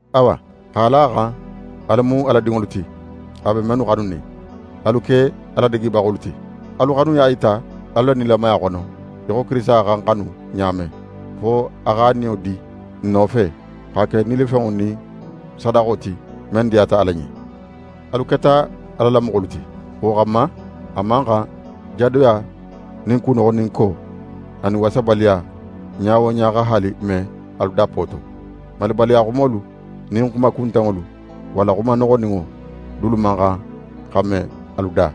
Awa, x'a la a xan alu mu Ala dinŋolu ti, a be mennu xanunin, alu ke a ladigibaxolu ti. Alu xanuya yita alu la nilamaya xono, í xo Kirisita xa n xanu ɲa men, fo a x'a niyo di n nofe, xa ke nilifenŋo nin sadaxo ti, men diyata Ala ɲen. Alu keta Ala la moxolu ti; wo xanma a man xan jadoya nin kunoxoninko, anin wasabaliya ɲa wo ɲa xa haali me alu dappo to. Malibaliya xumolu nin xuma kuntanŋolu walla xuma noxoninŋo dulu man xan xa me alu da.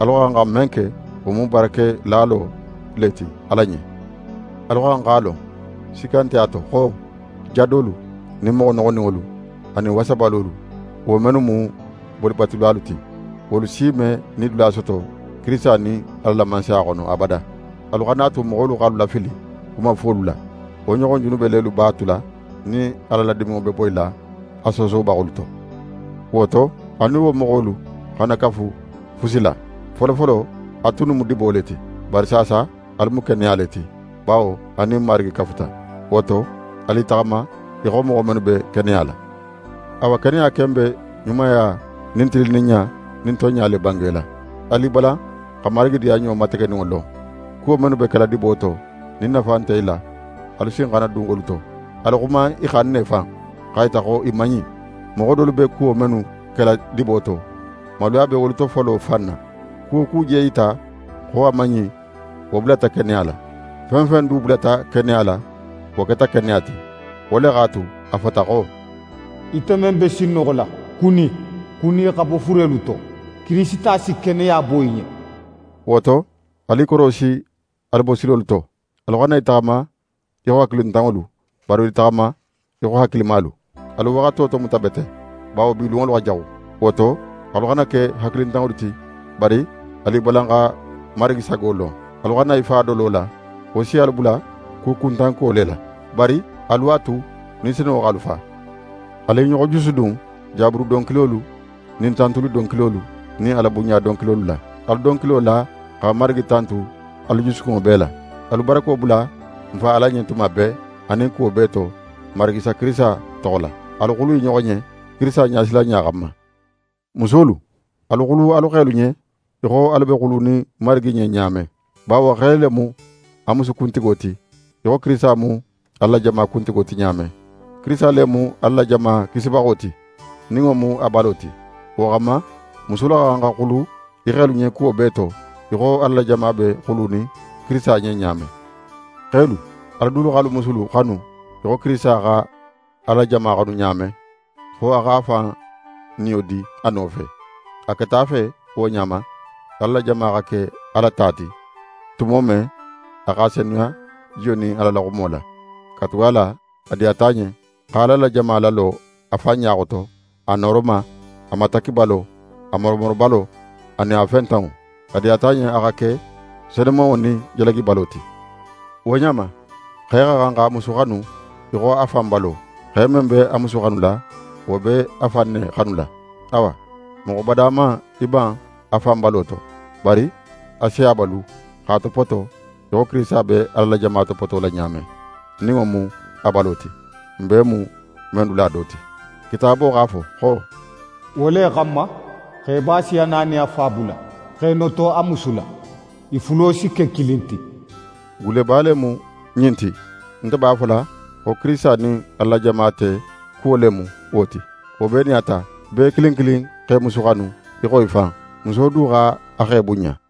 Alu xa xan xa men ke, wo mu barakelalo le ti Ala ɲen. Alu xa xan x'a lon, sikka nte a to xo: Jadolu nin moxo noxoninŋolu, anin wasabalolu, wo mennu mu bolibatulalu ti, wolu si me nidula soto Kirisita nin Ala la Mansaya xono abada. Alu xana a tu moxolu x'alu lafili xuma fuwolu la. Wo ɲoxon junube lelu b'a tula nin Ala la diminŋo be boyila a soosobaxolu to. Wo to, alu nin wo moxolu xana kafu fusi la. Folofolo, alu tunnu mu dibo le ti, bari saasa, alu mu keneya le ti, bawo alu nin Marigi kafuta. Wo to, alu i taxama í xo moxo mennu be keneya la. Awa, keneya ken be ɲumaya nin tilinninɲa nin tonɲa le bangela. Alu i balan xa Marigi diyanɲo mategeninŋo lon. Kuwo mennu be kela dibo to, nin nafa nte i la, alu sin xana dun wolu to. Alu xuma i xan ne fan, x'a yita xo i man ɲin. Moxo dolu be kuwo mennu kela dibo to, maluya be wolu tofolo fan na. Ku wo ku je yita xo a man ɲin, wo bulata keneya la. Fen fen du bulata keneya la, wo keta keneya ti. Wo le x'a tu, a fota xo: «Ite men be sinnoxola, kuni. Kuni xa bo furelu to, Kirisita si keneya bo í ɲen.» Wo to, alu i korosi alu bosilolu to. Alu xana i taxama í xo hakilintanŋolu, bari alu i taxama í xo hakilimalu. Alu waxato tomuta bete, bawo bi lunŋolu xa jaxu. Wo to, alu xana ke hakilintanŋolu ti, bari alu i balan xa Marigi sago lon. Alu xana i fa dolo la; wo si alu bula kukuntanko le la. Bari alu a tu Ni Senunŋo x'alu fa. Alu i ɲoxo jusudun Jaburu donkilolu nin tantuli donkilolu nin Alabunɲa donkilolu la. Alu donkilo la xa Marigi tantu alu jusukunŋo bee la. Alu barako bula n Fa Ala ɲen tuma bee, anin kuwo bee to, n Marigi Isa Kirisita toxo la. Alu xulu i ɲoxo ɲen, Kirisita ɲasilanɲa xanma. Musolu, alu xulu alu xelu ɲen í xo alu be xulunin Marigi ɲen ɲa men. Bawo, xe le mu a musu kuntigo ti, í xo Kirisita mu Ala la jama kuntigo ti ɲa men. Kirisita le mu Ala la jama Kisibaxo ti, nin wo mu a balo ti. Wo xanma, musolu xa xan xa xulu i xelu ɲen kuwo bee to, í xo Ala la jama be xulunin Kirisita ɲen ɲa men. Xelu, alu dulu x'alu musulu xanu í xo Kirisita xa Ala la jama xanu ɲa men, fo a x'a fan niyo di a nofe. A keta a fe wo ɲa ma Ala la jama xa ke Ala ta ti, tumo men a x'a senuya jiyo nin Ala la xumo la. Katugala a diyata a ɲen xa Ala la jama lalo a fan ɲa xoto, a nooroma, a matakkibalo, a moromorobalo, anin a fentanŋo. A diyata a ɲen a xa ke senumanŋo nin jalagibalo ti. Wo ɲa ma, xe xa xan x'a musu xanu í xo a fan balo. Xe men be a musu xanula, wo be a fan ne xanula. Awa moxo bada man í ban a fan balo to; bari a si a balu, x'a topoto, í xo Kirisita be Ala la jama topotola ɲa men, nin wo mu a balo ti, n bee mu men dula do ti. Kitaabo x'a fo xo: «Wo le xanma, xeba si a na nin a fa bula x'é noto a musu la; i fulo si ke kilin ti.» Gulleba le mu ɲin ti. Nte b'a fola xo Kirisita nin Ala la jama te kuwo le mu le wo ti. Wo bee nin a ta, bee kilin kilin x'é musu xanu í xo í fan. Muso du x'a xe bunɲa.